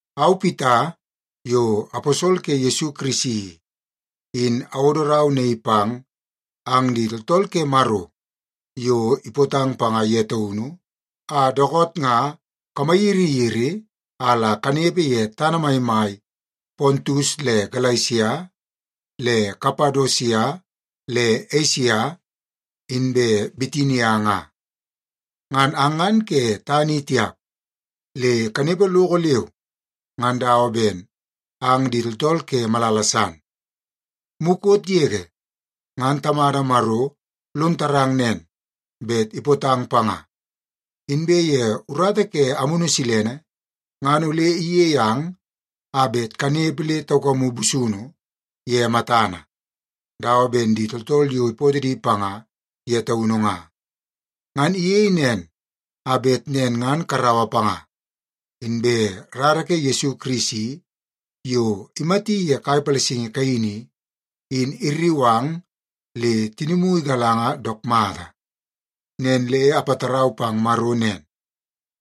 Au, Pita, yo aposol ke Yesu Kirisi i, in awodo rau naii pang ang di tooltool ke Maro yo ipootang panga ye taunu a dookoot nga kamayiriyiri a la kanepe ye tana maimai Pontus le Galesia le Kapadosia le Esia inbe Bitinia nga. Ngan ang ngan ke tana i tiap, le kanepe loko leu ngan dawa ben ang di tooltool ke malala san. Mukot yege ngan Tamada Maro lon tarang nen, bet ipootang panga, inbe ye urata ke Amunu Silene ngan ole iyei ang a bet kanepe le taukamu busunu ye matana dawa ben di tooltool yo ipootoo di panga ye taunu nga. Ngan iyei nen a bet nen ngan karaua panga, inbe rara ke Yesu Kirisi yo imati ye kai palasingi kaini i, in irriu ang le tinimu igalanga dook mata. Nen le apatarau pang Maro nen,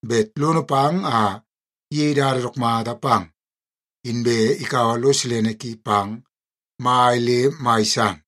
bet lono pang a iyei dada dook mata pang, inbe ikaua lo silene ki pang mai le mai san.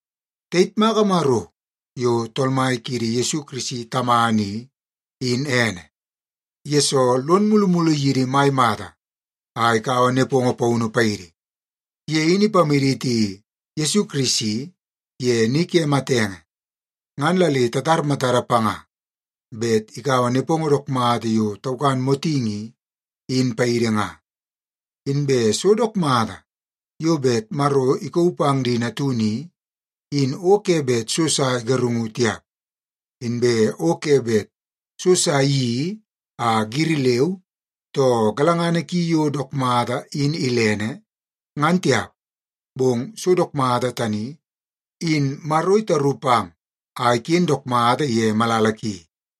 Tayitmaka Maro yo Tool Mai kiidi Yesu Kirisi Tamana i, in ene, yesoo lon mulumulu yidi mai mata a ikaua nepongo paunu paidi. Ye in ipamaditi Yesu Kirisi ye ni ke matenge ngan la le tatar matada panga bet ikaua nepongo dook mata yo taukan motingi i, in paidi nga. Inbe so dook mata yo bet Maro ikauu pang di natunu i, in o ke bet so sa igarungu tiap. Inbe o ke bet so sa iyeii a giri leu, too galangana ki yo dook mata in ilene, ngan tiap. Bong so dook mata tani, in Maro itaru pang a iken dook mata ye malala ki.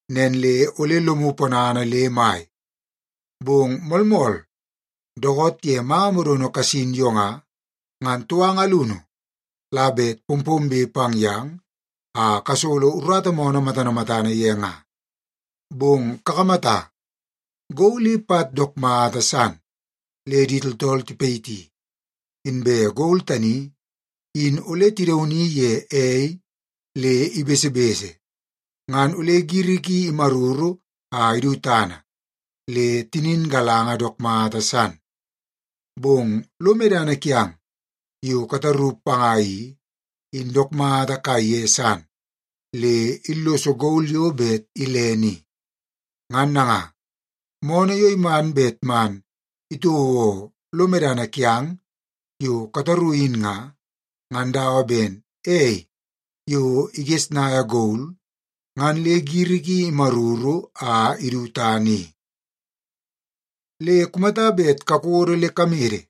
Nen le ole lomu ponana le mai! Bong moolmool, dookoot ye manga modono kasin yo nga, ngan touanga alunu la bet pompombe pang yang a kasolo urata moonoo matana matana ye nga. Bong kakamata, gol i pat dook mata san le di tooltool tipayiti. Inbe gol tani in ole tidauni ye ei le ibesebese, ngan ole giri ki imaruru a idu tana, le tinin galanga dook mata san. Bong lo medana kiang yo kataru panga i, in dook mata kaiye san le illoso gol yo bet ilene i. Ngan nanga, moonoo yo iman bet man itouo lo medana kiang yo kataru in nga, ngan dawa ben ei yo igesnaia gol ngan le giri ki imaruru a idu tana i. Le kumata bet kakodo le kamede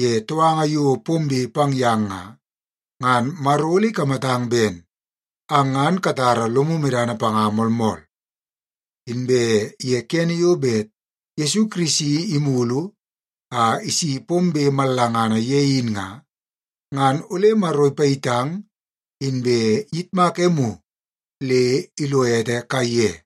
ye touanga yo pombe pang yang nga, ngan Maro ole ikamatang ben ang ngan katara lomu medana panga moolmool, inbe ye kene yo bet Yesu Kirisi imulu a isi pombe mallangana ye in nga, ngan ole Maro ipayitang inbe iyitmak emu le ilo ete kaiye.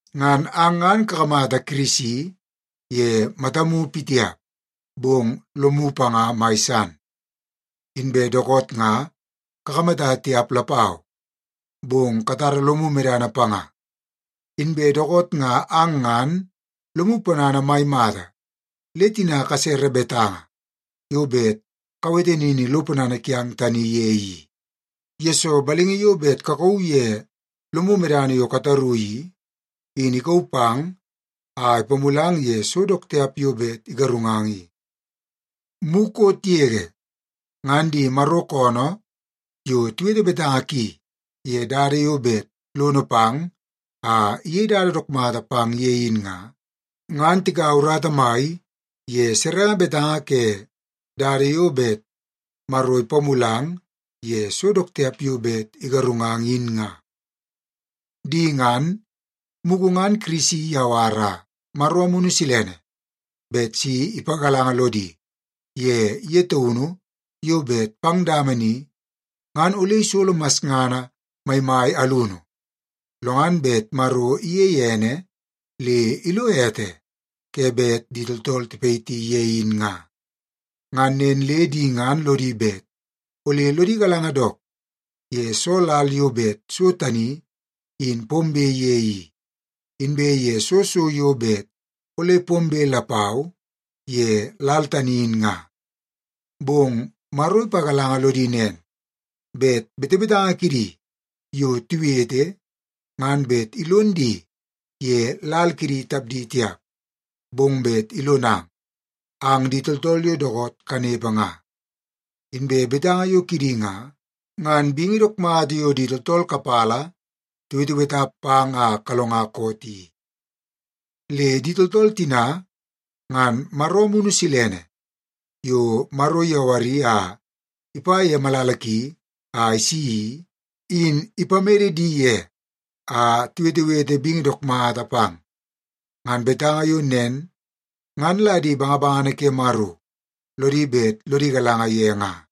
Ngan ang ngan kakamata Kirisi ye matamu pitiap, bong lomu panga mai san. Inbe dookoot nga kakamata tiap lapau, bong katara lomu medana panga. Inbe dookoot nga ang ngan lomu ponana mai mata le tina kasere betanga yo bet kawete nini lo ponana kiang tani ye i, yesoo balingi yo bet kakauu ye lomu medana yo kataru i, in ikauu pang a ipamulang ye so dook tiap yo bet igarungang i. Mukot yege, ngan di Maro koonoo yo tiwete betanga ki ye dada yo bet lono pang a iyei dada dook mata pang ye in nga, ngan tikaua urata mai ye serenge betanga ke dada yo bet Maro ipamulang ye so dook tiap yo bet igarungang in nga. Di ngan, mugu ngan Kirisi iyawara Maro Amunu Silene bet si ipagalanga lodi ye ye taunu yo bet pang dama ni, ngan ole isolo masngana maimai alunu, lo ngan bet Maro iyeie ene le ilo ete ke bet di tooltool tipayiti ye in nga. Ngan nen le di ngan lodi bet ole lodi galanga dook ye soo lal yo bet so tani in pombe ye i, inbe ye soo so yo bet ole pombe lapau ye lal tani in nga. Bong Maro ipagalanga lodi nen, bet betebetanga kidi yo tiwete, ngan bet ilon di ye lal kidi tapdi tiap, bong bet ilonang, ang di tooltool yo dookoot kanepe nga. Inbe betanga yo kidi nga, ngan bingi dook mata yo di tooltool kapala tiweteweta pang a kalonga koot i. Le di tooltool tina, ngan Maro Amunu Silene yo Maro iyawari a ipa ye malala ki a isi i, in ipamede di ye a tiwetewete bingi dook mata pang. Ngan betanga yo nen ngan la di bangabangana ke Maro lodi bet lodi galanga ye nga.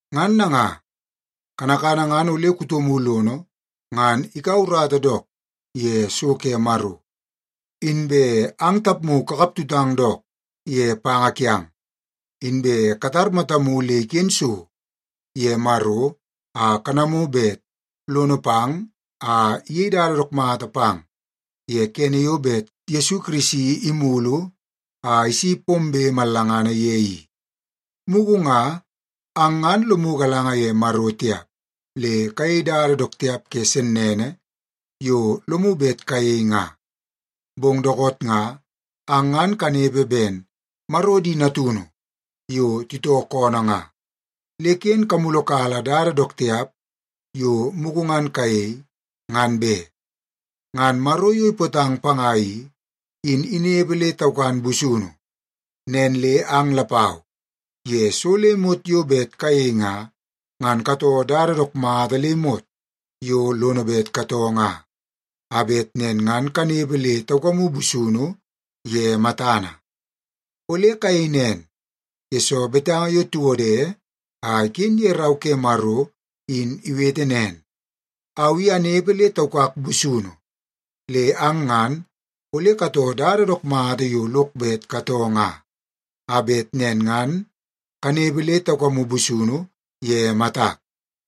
Ngan nanga, kanakana ngan ole kutomu lono ngan ikaua urata dook ye so ke Maro, inbe ang tapmu kakap tutang dook ye panga kiang. Inbe katar matamu le iken so ye Maro a kanamu bet lono pang a iyei dada dook mata pang ye kene yo bet Yesu Kirisi imulu a isi pombe mallangana ye i. Mugu nga ang ngan lomu galanga ye Maro tiap, le kayei dada dook tiap ke sennene yo lomu bet kayei nga. Bong dookoot nga, ang ngan kanepe ben Maro di natunu yo titoo koonoo nga, le ken kamulukala dada dook tiap yo mugu ngan kayei, ngan be. Ngan Maro yo ipootang panga i, in inepe le taukan busunu. Nen le ang lapau, ye so le imot yo bet kayei nga, ngan katoo dada dook mata le imot yo lono bet katoo nga, a bet nen ngan kanepe le taukamu busunu ye matana. Ole kayei nen, yesoo betanga yo tiwode a iken ye Rau ke Maro in iwete nen, “Au i anepe le taukak busunu, le ang ngan ole katoo dada dook mata yo lok bet katoo nga, a bet nen ngan kanepe le taukamu busunu ye matak.”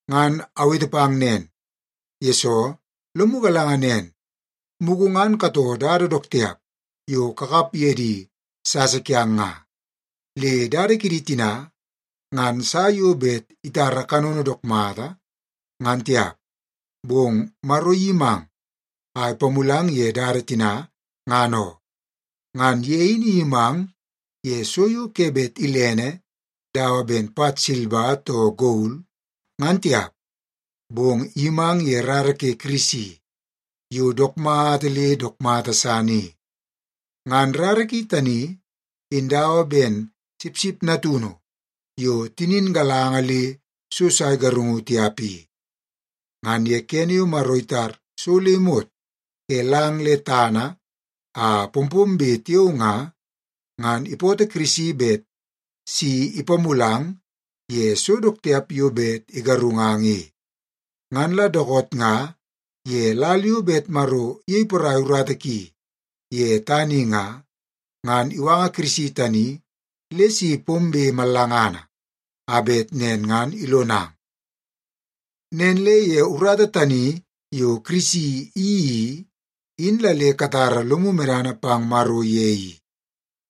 Ngan awete pang nen, yesoo lomu galanga nen, mugu ngan katoo dada dook tiap yo kakap ye di sasa kiang nga. Le dada kidi tina, ngan sa yo bet itara kanono dook mata ngan tiap, bong Maro iyimang a ipamulang ye dada tina, ngan oo. Ngan ye in iyimang ye so yo ke bet ilene dawa ben pat silba too gol, ngan tiap. Bong iyimang ye rara ke Kirisi yo dook mata le dook mata san i. Ngan rara ki tani in dawa ben sipsip natunu yo tinin galanga le so sa igarungu tiap i. Ngan ye kene yo Maro itar so le imot ke lang le tana a pompombe tiao nga, ngan ipootoo Kirisi bet si ipamulang ye so dook tiap yo bet igarungang i. Ngan la dookoot nga ye lal yo bet Maro iyei porai urata ki ye tana i nga, ngan iwanga Kirisi tani le si pombe mallangana a bet nen ngan ilonang. Nen le ye urata tani yo Kirisi iyeii i, in la le katara lomu medana pang Maro ye i.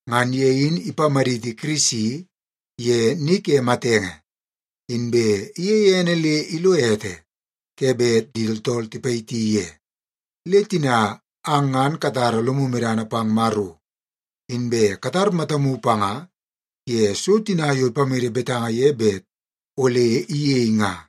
Ngan ye in ipamaditi Kirisi ye ni ke matenge, inbe iyeie ene le ilo ete ke bet di tooltool tipayiti ye. Le tina ang ngan katara lomu medana pang Maro, inbe katar matamu panga ye so tina yo ipamede betanga ye bet ole iyei nga.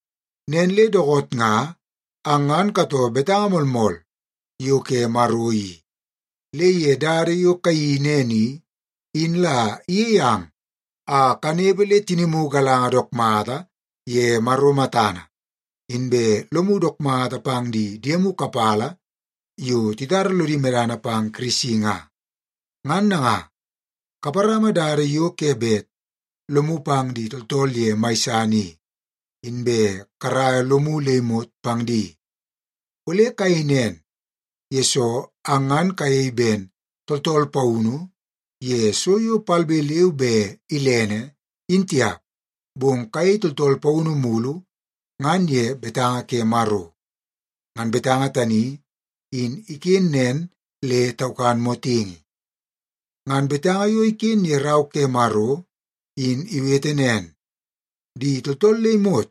Nen le dookoot nga ang ngan katoo betanga moolmool yo ke Maro i, le ye dada yo kayeii nen i, in la iyei ang a kanepe le tinimu galangana dook mata ye Maro matana, inbe lomu dook mata pang di diemu kapala yo titara lodi medana pang Kirisi nga. Ngan nanga, kaparama dada yo ke bet lomu pang di tooltool ye mai san i, inbe karaia lomu le imot pang di. Ole kayei nen, yesoo ang ngan kayei ben tooltool paunu ye so yo palbe leu be ilene, in tiap, bong kayei tooltool paunu mulu ngan ye betanga ke Maro. Ngan betanga tani in iken nen le taukan motingi. Ngan betanga yo iken ye Rau ke Maro in iwete nen, “Di tooltool le imot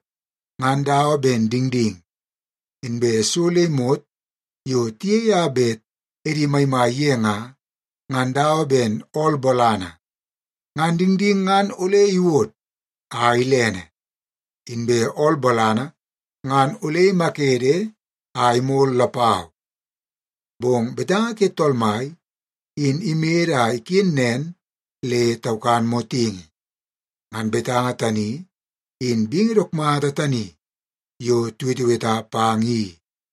ngan dawa ben dingding. Inbe so le imot yo tiyei a bet edi maimai ye nga, ngan dawa ben ool bolana. Ngan dingding ngan ole iwod a ilene, inbe ool bolana ngan ole imakede a imol lapau. Bong betanga ke Tool Mai, in imede a iken nen le taukan motingi.” Ngan betanga tani, in bingi dook mata tani yo tiweteweta pang i.